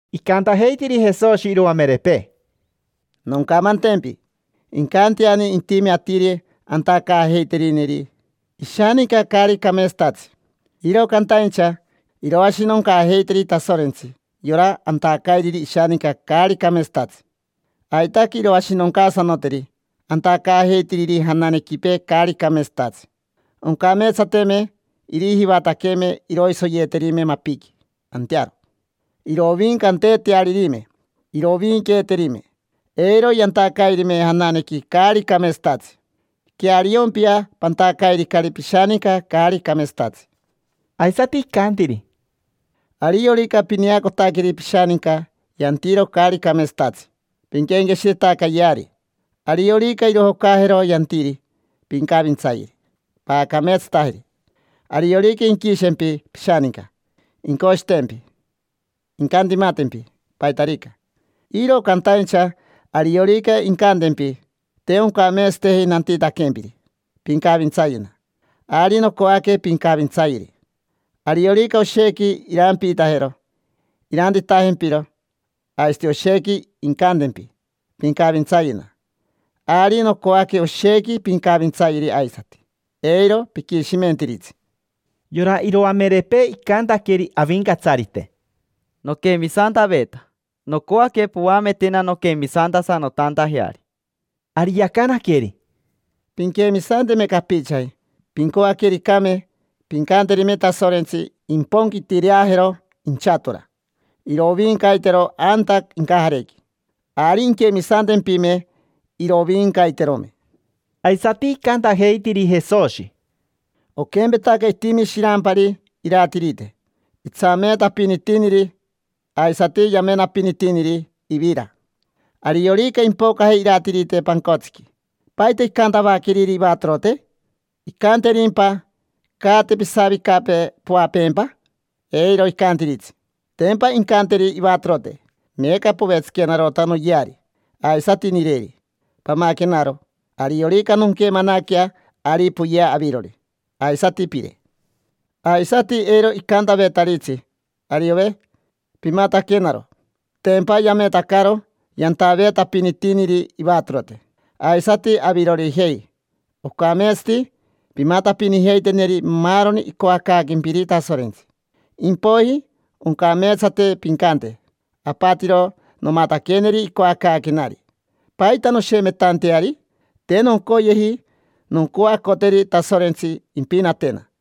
Icantajeitiri Jesoshi iroamerepee: —Noncamantempi: incanteani intime atiri antacaajeiterineri ishaninca caari cameetsatatsi. Iro cantaincha iroashinoncaajeiteri Tasorentsi yora antacairiri ishaninca caari cameetsatatsi. Aitaque iroashinoncaasanoteri antacaajeitiriri jananequipee caari cameetsatatsi. Oncameetsateme irijivataqueme iroisoyeeterime mapiqui antearo, irovincanteetearirime. Irovinqueeterime, eiro yantacairime jananequi caari cameetsatatsi. Queariompia, pantacairicari pishaninca caari cameetsatatsi. Aisati icantiri: —Ariorica pineacotaqueri pishaninca yantiro caari cameetsatatsi, pinquenqueshiretacayeari. Ariorica irojocajero yantiri, pincavintsayeri, paacameetsatajeri. Ariorica inquishempi pishaninca, incoshitempi, incantimatempi, paitarica. Iro cantaincha ariorica incantempi: “Te oncameetsateji nantitaquempiri, pincavintsayena”, ari nocoaque pincavintsayeri. Ariorica oshequi irampiitajero irantitajempiro, aisati oshequi incantempi: “Pincavintsayena”. Ari nocoaque oshequi pincavintsayeri aisati, eiro piquishimentiritsi. Yora iroamerepee icantaqueri Avincatsarite: —Noquemisantaveta. Nocoaque poametena nonquemisantasanotantajeari. Ari yacanaqueri: —Pinquemisanteme capichaji, pincoaquericame, pincanterime Tasorentsi imponquitireajero inchatora, iroviincaitero anta incajarequi. Ari inquemisantempime, iroviincaiterome. Aisati icantajeitiri Jesoshi: —Oquempetaca itimi shirampari iratirite. Itsameetapinitiniri aisati yamenapinitiniri ivira. Ariorica impocaje iratirite pancotsiqui, ¿paita incantavaqueriri ivatorote? ¿Incanterimpa: “Caate, pisavicapee, poapeempa”? Eiro icantiritsi. Tempa incanteri ivatorote: “Meeca povetsiquenarota noyeari, aisati nireri. Pamaquenaro. Ariorica nonquemanaquea, ari poyea avirori, aisati pire”. Aisati eiro icantavetaritsi: “Ariove, pimataquenaro”; tempa yametacaro yantaveetapinitiniri ivatorote. Aisati avirorijei, ocameetsati pimatapinijeiteneri maaroni icoacaaquempiri Tasorentsi. Impoiji oncameetsate pincante: “Apatiro nomataqueneri icoacaaquenari. ¿Paita noshemetanteari? Te noncoyeji noncoacoteri Tasorentsi impinatena”.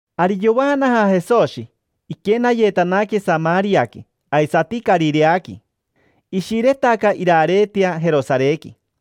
Ari yovaanaja Jesoshi, iquenayetanaque Samariaqui aisati Carireaqui. Ishiretaca irareetea Jerosarequi.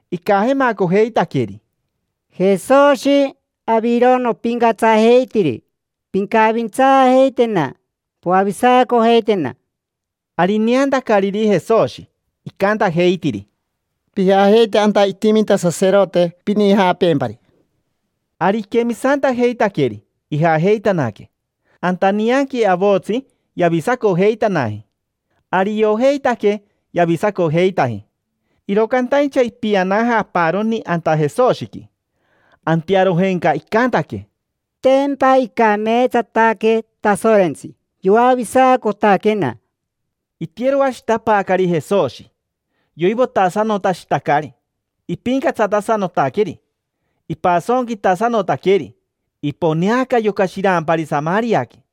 Icajemacojeitaqueri: —Jesoshi, aviro nopincatsajeitiri, pincavintsaajeitena, poavisacojeitena. Ari ineantacariri Jesoshi, icantajeitiri: —Pijajeite anta itiminta saserote, pinijapeempari. Ari iquemisantajeitaqueri, ijajeitanaque. Anta nianqui avotsi yavisacojeitanaji. Ari iojeitaque yavisacojeitaji, iro cantaincha ipianaja aparoni anta Jesoshiqui. Antearojenca icantaque: —Tempa icameetsataque Tasorentsi, yoavisacotaquena. Itiyeroashitapaacari Jesoshi, yoivotasanotashitacari, ipincatsatasanotaqueri, ipasonquitasanotaqueri. Iponeaca yoca shirampari Samariaqui.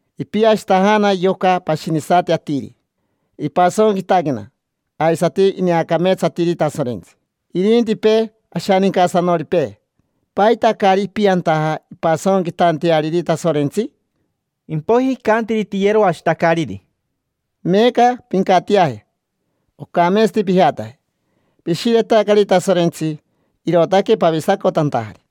Ipiashitajana yoca pashinisati atiri, ipasonquitaquena, aisati ineacameetsatiri Tasorentsi. Irintipee ashanincasanoripee, ¿paita caari ipiantaja impasonquitanteariri Tasorentsi? Impoiji icantiri tiyeroashitacariri: —Meeca pincatiaje, ocameetsati pijataje. Pishiretacari Tasorentsi, irootaque pavisacotantajari.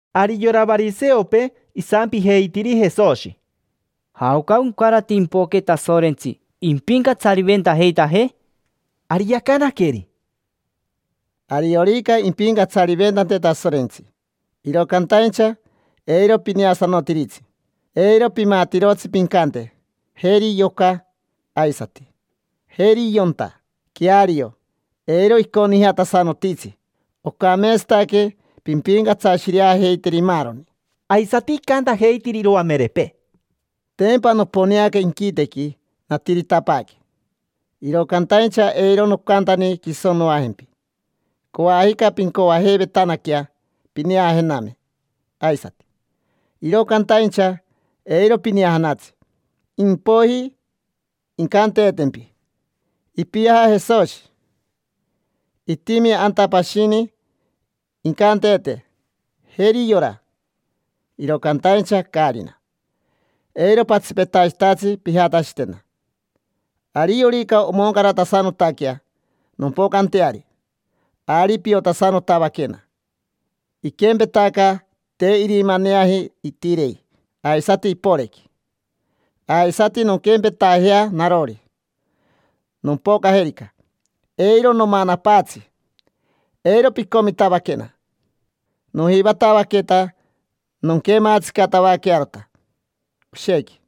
Ari yora variseopee isampijeitiri Jesoshi: —¿Jaoca oncarate impoque Tasorentsi impincatsariventajeitajee? Ari yacanaqueri: —Ariorica impincatsariventante Tasorentsi, iro cantaincha eiro pineasanotiritsi. Eiro pimatirotsi pincante: “Jeri yoca”, aisati: “Jeri yonta”. Queario, eiro iconijatasanotitsi: ocameetsataque pimpincatsashireajeiteri maaroni. Aisati icantajeitiri iroamerepee: —Tempa noponeaca inquitequi, natiritapaaque, iro cantaincha eiro nocantani quiso noajempi. Coajica pincoajeivetanaquea pineajename aisati, iro cantaincha eiro pineajanatsi. Impoiji incanteetempi: “Ipiaja Jesoshi, itimi anta”, pashini incanteete: “Jeri yora”. Iro cantaincha caarina. Eiro patsipetashitatsi pijatashitena. Ariorica omoncaratasanotaquea nompocanteari, ari piotasanotavaquena. Iquempetaca te irimaneaji itirei, aisati iporequi; aisati nonquempetajea narori, nompocajerica. Eiro nomanapaatsi, eiro picomitavaquena. Nojivatavaqueta nonquematsicatavaquearota oshequi,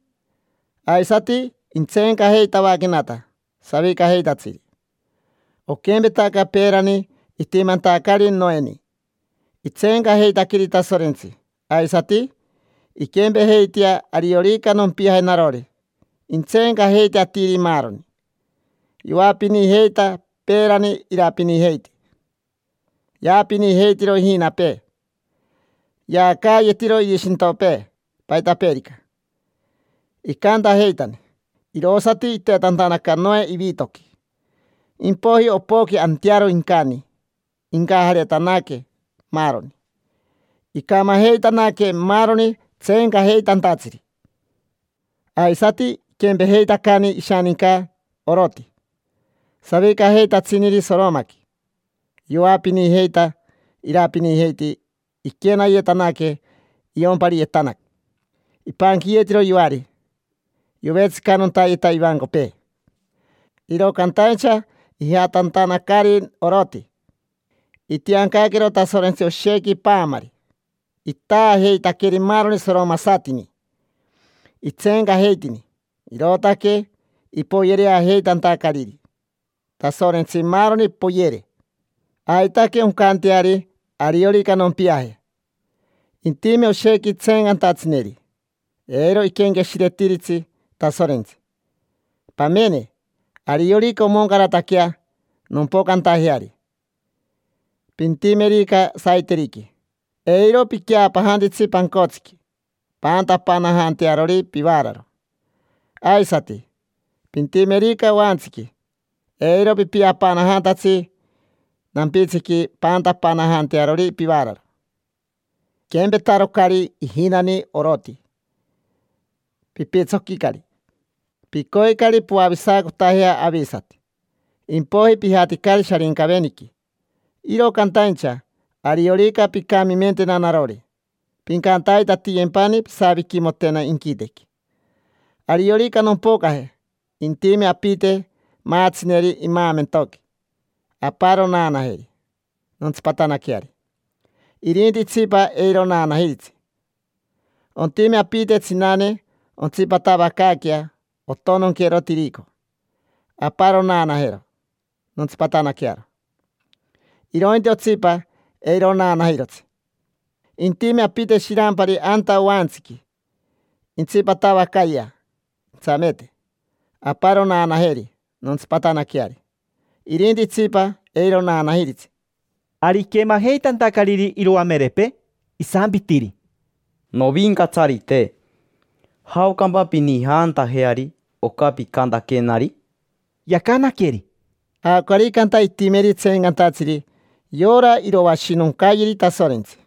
aisati intseencajeitavaquenata savicajeitatsiri. Oquempetaca peerani itimantacari Noeni itseencajeitaqueri Tasorentsi, aisati inquempejeitea ariorica nompiaje narori, intseencajeite atiri maaroni. Yoapinijeita peerani, irapinijeiti, yaapinijeitiro ijinapee, yaacaayetiro irishintopee, paitapeerica. Icantajeitani, irosati itetantanaca Noe ivitoqui. Impoiji opoqui antearo incani, incajaretanaque maaroni. Icamajeitanaque maaroni tseencajeitantatsiri. Aisati iquempejeitacani ishaninca Oroti, savicajeitatsiniri Soromaqui: yoapinijeita, irapinijeiti, iquenayetanaque iyompariyetanaca, ipanquiyetiro yoari, yovetsicanontayeta ivancopee. Iro cantaincha ijatantanacari Oroti, itiancaquero Tasorentsi oshequi paamari, itaajeitaqueri maaroni soromasatini. Itseencajeitini, irootaque ipoyereajeitantacariri Tasorentsi maaroni, poyere. Aitaque oncanteari ariorica nompiaje. Intime oshequi tseencantatsineri, eiro iquenqueshiretiritsi Tasorentsi. Pamene, ariorica omoncarataquea nompocantajeari, pintimerica saiteriqui, eiro piqueapanajantitsi pancotsiqui paantapanajantearori pivaararo. Aisati, pintimerica oantsiqui, eiro pipiapanajantatsi nampitsiqui paantapanajantearori pivaararo. Piquempetarocari ijinani Oroti, pipitsoquicari. Picoicari poavisacotajea avisati, impoiji pijaticari Sharincaveniqui. Iro cantaincha ariorica pincamimentena narori, pincantaitatiyempani pisaviquimotena inquitequi. Ariorica nompocaje, intime apite maatsineri imaamentoqui. Aparo naanajeri nontsipatanaqueari, irinti itsipa, eiro naanajiritsi. Ontime apite tsinane ontsipatavacaaquea ontononquero tirico. Aparo naanajero nontsipatanaquearo, irointi otsipa, eiro naanajirotsi. Intime apite shirampari anta oantsiqui, intsipatavacayea intsameete. Aparo naanajeri nontsipatanaqueari, irinti itsipa, eiro naanajiritsi. Ari iquemajeitantacariri iroamerepee, isampitiri: —Novincatsarite, ¿jaocampa pinijantajeari oca picantaquenari? Yacanaqueri: —Jaocarica anta intimeri tseencantatsiri, yora iroashinoncayeri Tasorentsi.